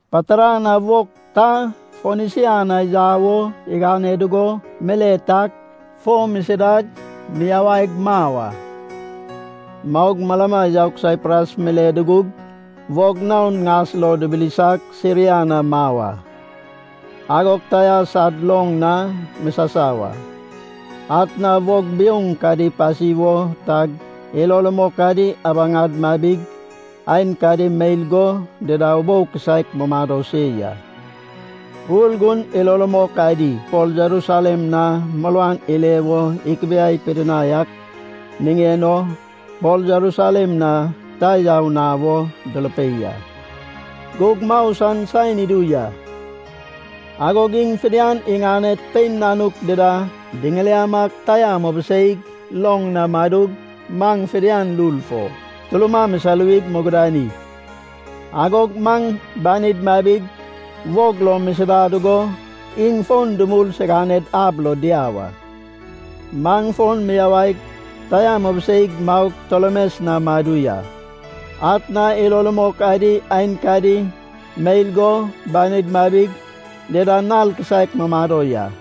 Patara na wog ta Fonisia na yau o igane dugo mile tag fo misidag miyawaig mau a. Maug malama yaug Saipras mile dugug wog naon ŋas lo dibilisag, Siria na mau a. Agog Taia sad loŋ na misasau a. Atna wog biouŋ kadi ipasi wo tag ilo rumok adi abaŋad mabig aenkadi meil go dida ubou kisaek mumado se ya. Urgun ilo rumok adi Pol Jerusalem na muruan ile wo ikibiai pidinai ak niŋen o Pol Jerusalem na ta yau na wo durupei a. Gug mau san saen idu ya. Agog iŋ fidian iŋaned pein nanuk dida diŋiliamag Taia mubiseig loŋ na madug, maŋ fidian lul fo turuma misaluwig mugudani. Agog maŋ banid mabig wog lo misida dugo iŋ fon dumul siganed ab lo diau a. Maŋ fon miyawaig Taia mubiseig maug, Tolemes na madu ya. Atna ilo rumok adi aenkadi meil go banid mabig, dida nal kisaek mumado ya.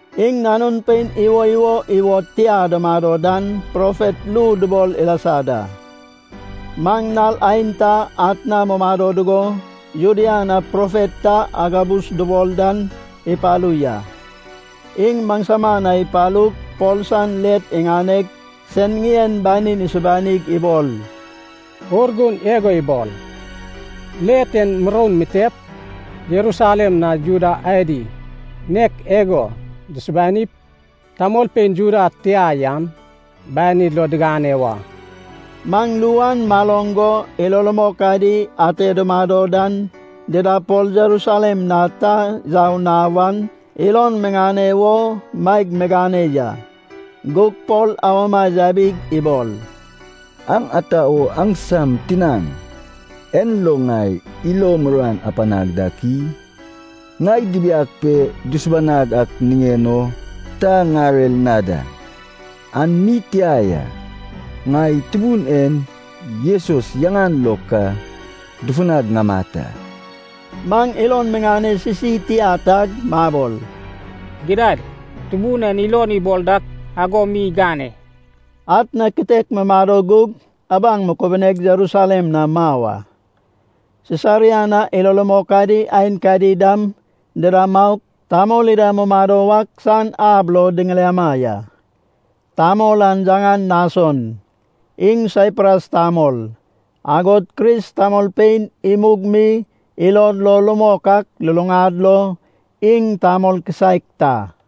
Iŋ nanun pein iwoiwo iwod tia dumado dan profet ru dubol ilasa da. Maŋ nal aenta atna mumado dugo, Judea na profet ta Agabus dubol dan ipalu ya. Iŋ maŋsama na ipalug, Pol san let iŋaneg sen ŋien banin isubanig ibol, “Urgun igo ibol, ‘Let en muroun mitep Jerusalem na Juda adi nek igo dusubanip, tamolpein Juda tia yan banid lo digane wa.’” Maŋ ru an maloŋ go ilo rumok adi ate dumado dan dida Pol Jerusalem na ta yau na wan ilon miŋane wo maeg migane ya. Gug Pol awama yabig ibol, “Aŋ ata wo aŋsam tinaŋ en lo ŋai ilo muruan apanag dak i? Ŋai dibiag pe dusubanag ak niŋen o ta ŋarer na da. An mi tia ya. Ŋai Tubun en Jesus yaŋan lo ka dufunag ŋamat a.” Maŋ ilon miŋane sisi tia tag mabol, “Gidad, Tubun en ilon ibol dak ago mi igane.” Atna kitek mumado gug abaŋ mukubuneg Jerusalem na mau a. Sisaria na ilo rumok adi aenkadi dam dida maug, tamol ida mumado wak san ab lo diŋiliama ya. Tamol an yaŋan Nason. Iŋ Saipras tamol, agod Kris tamolpein imug mi ilod lo rumok ak luluŋad lo iŋ tamol kisaek ta.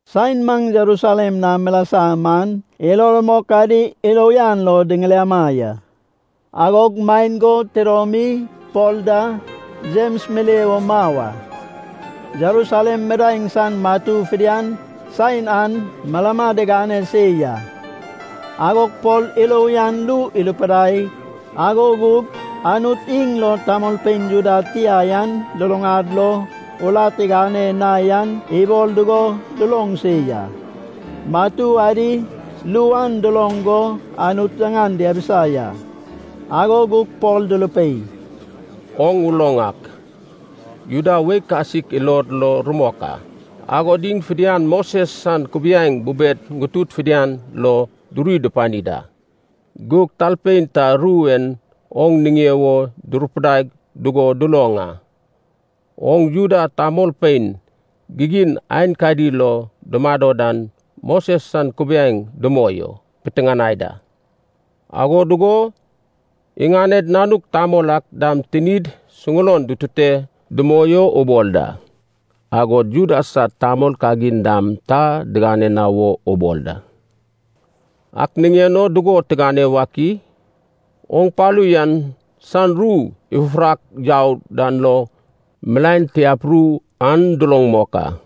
Saen maŋ Jerusalem na milasa man ilo rumok adi ilo uyan lo diŋiliama ya. Agog maen go tidomi Pol da Jems mile wo mau a. Jerusalem midaeŋ san matu fidian saen an malama digane se ya. Agog Pol ilo uyan ru irupidai, ago gug Anut iŋ lo tamolpein Juda tia yan luluŋad lo urat igane na yan ibol dugo duloŋ se ya. Matu adi ru an duloŋ go Anut yaŋan diabisa ya. Ago gug Pol durupei, “Oŋ uloŋ ak, Juda wei kasik ilod lo rumok a. Agod iŋ fidian Moses san kubiaeŋ bubed ŋutudi fidian lo duri dupani da. Gug talpein ta ru en oŋ niŋe wo durupidai dugo duloŋ a. Oŋ Juda tamolpein gigin aenkadi lo dumado dan Moses san kubiaeŋ dumoi o piteŋanai da. Ago dugo iŋaned nanuk tamol ak dam tinid suŋulon dutute dumoi o ubol da, agod Juda sad tamol kagin dam ta digane na wo ubol da. Ak niŋen o dugo tigane wak i? Oŋ palu yan san ru ifufurak yau dan lo milaen tiap ru an duloŋ mok a.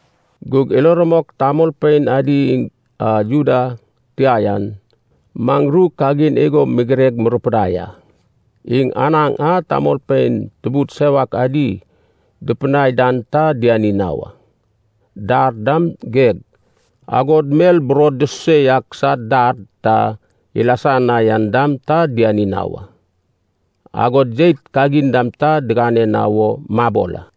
Gug ilo rumok tamolpein adi iŋ a Juda tia an, maŋ ru kagin igo migireg murupidai a. Iŋ anaŋ a tamolpein tubud sewak adi dupidinai dan ta diani na wa. Dar dam geg. Agod mel burod dususe yak sad dar ta ilasa na yan dam ta diani na wa. Agod jeit kagin dam ta digane na wo mabol a.”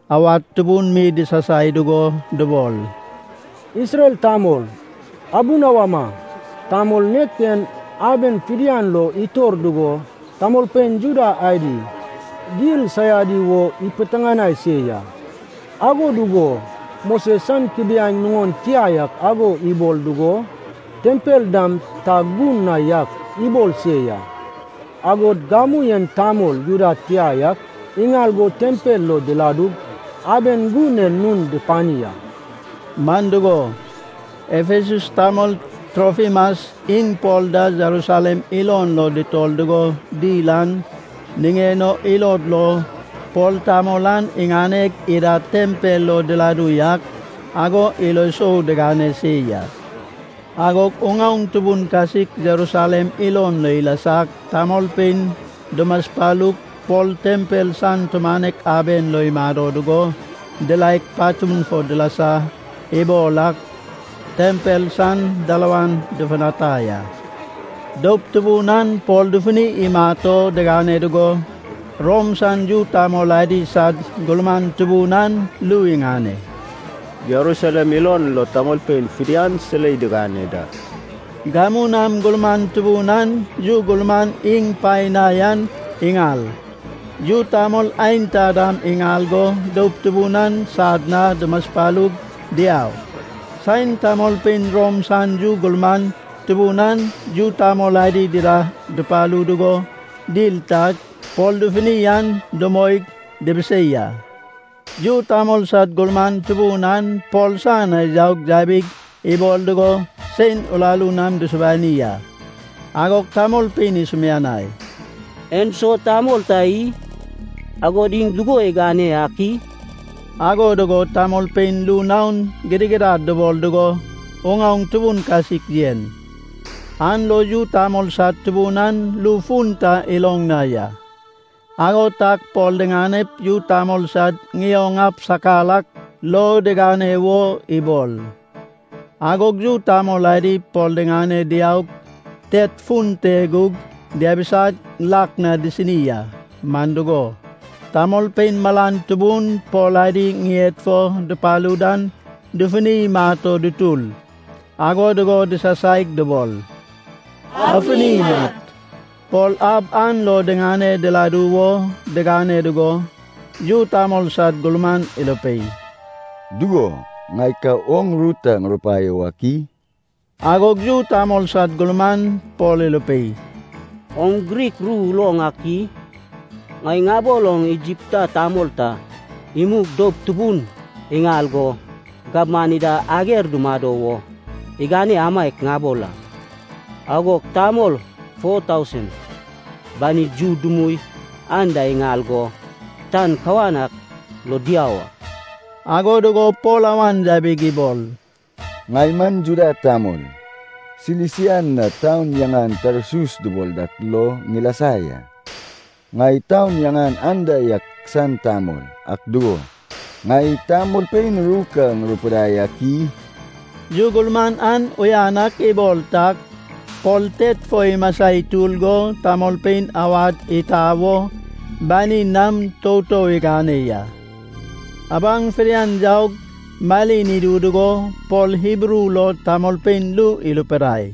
awad tubun mi disasai dugo dubol, “Isrel tamol! Abunawama! Tamol nek en aben fidian lo itor dugo tamolpein Juda adi dil saiadi wo ipiteŋanai se ya. Ago dugo Moses san kubiaeŋ nuŋon tia yak ago ibol dugo, tempel dam ta gun na yak ibol se ya. Agod gamu en tamol Juda tia yak iŋal go tempel lo diladug, aben gun en nun dupani a.” Man dugo, Efasas tamol Trofimas iŋ Pol da Jerusalem ilon lo dutor dugo dil an niŋen o ilod lo Pol tamol an iŋaneg ida tempel lo diladu yak, ago ilo sou digane se ya. Agog uŋaoŋ tubun kasik Jerusalem ilon lo ilasag tamolpein dumaspalug, Pol tempel san tumanek aben lo imado dugo diraeg, patun fo dilasa ibol ak tempel san dalawan dufutanai a. Doup tubun an Pol dufuni imat o digane dugo, Rom san yu tamol adi sad gurman tubun an ru iŋane, “Jerusalem ilon lo tamolpein fidian silei digane da.” Gamu nam gurman tubun an yu gurman iŋ paen na yan iŋal, yu tamol aenta dam iŋal go doup tubun an sad na dumaspalug diau. Saen tamolpein Rom san yu gurman tubun an yu tamol adi dida dupalu dugo dil tag Pol dufuni an dumoig dibisei a. Yu tamol sad gurman tubun an Pol san na yaug yabig ibol dugo sein uraru nam dusubani a. Agog tamolpein isumianai, “En so tamol ta i? Agod iŋ dugo igane ak i?” Ago dugo tamolpein ru naon gidigidad dubol dugo uŋaoŋ tubun kasik yen. An lo yu tamol sad tubun an ru fun ta iloŋ na ya. Ago tag Pol diŋanep yu tamol sad ŋioŋ ab sakar ak lo digane wo ibol. Agog yu tamol adi Pol diŋane diaug, tet fun te gug diabisag, lak na disini a. Man dugo, tamolpein malan tubun Pol adi ŋied fo dupalu dan dufuni imat o dutur. Ago dugo disasaig dubol, “Afuni imat!” Pol ab an lo diŋane diladu wo digane dugo, yu tamol sad gurman irupei, “Dugo, ŋai ka oŋ ru ta ŋurupaio wak i?” Agog yu tamol sad gurman Pol irupei, “Oŋ Grik ru uloŋ ak i? Ŋai ŋabol oŋ Igipta tamol ta imug doup tubun iŋal go gabman ida ager dumado wo igane amaiak ŋabol a. Agog tamol foa tausen banid yu dumui anda iŋal go tan kawan ak lo diau a.” Ago dugo Pol awan yabig ibol, “Ŋai man Juda tamol, Silisia na taun yaŋan Tarsus dubol dak lo ŋilasa ya. Ŋai taun yaŋan anda yak san tamol. Ak dugo, ŋai tamolpein ru ka ŋurupidai ak i?” Yu gurman an uyan ak ibol tag Pol tet fo imasa itur go tamolpein awad itau wo banin nam toutou igane ya. Abaŋ fidian yaug malin idu dugo Pol Hibru lo tamolpein ru irupidai.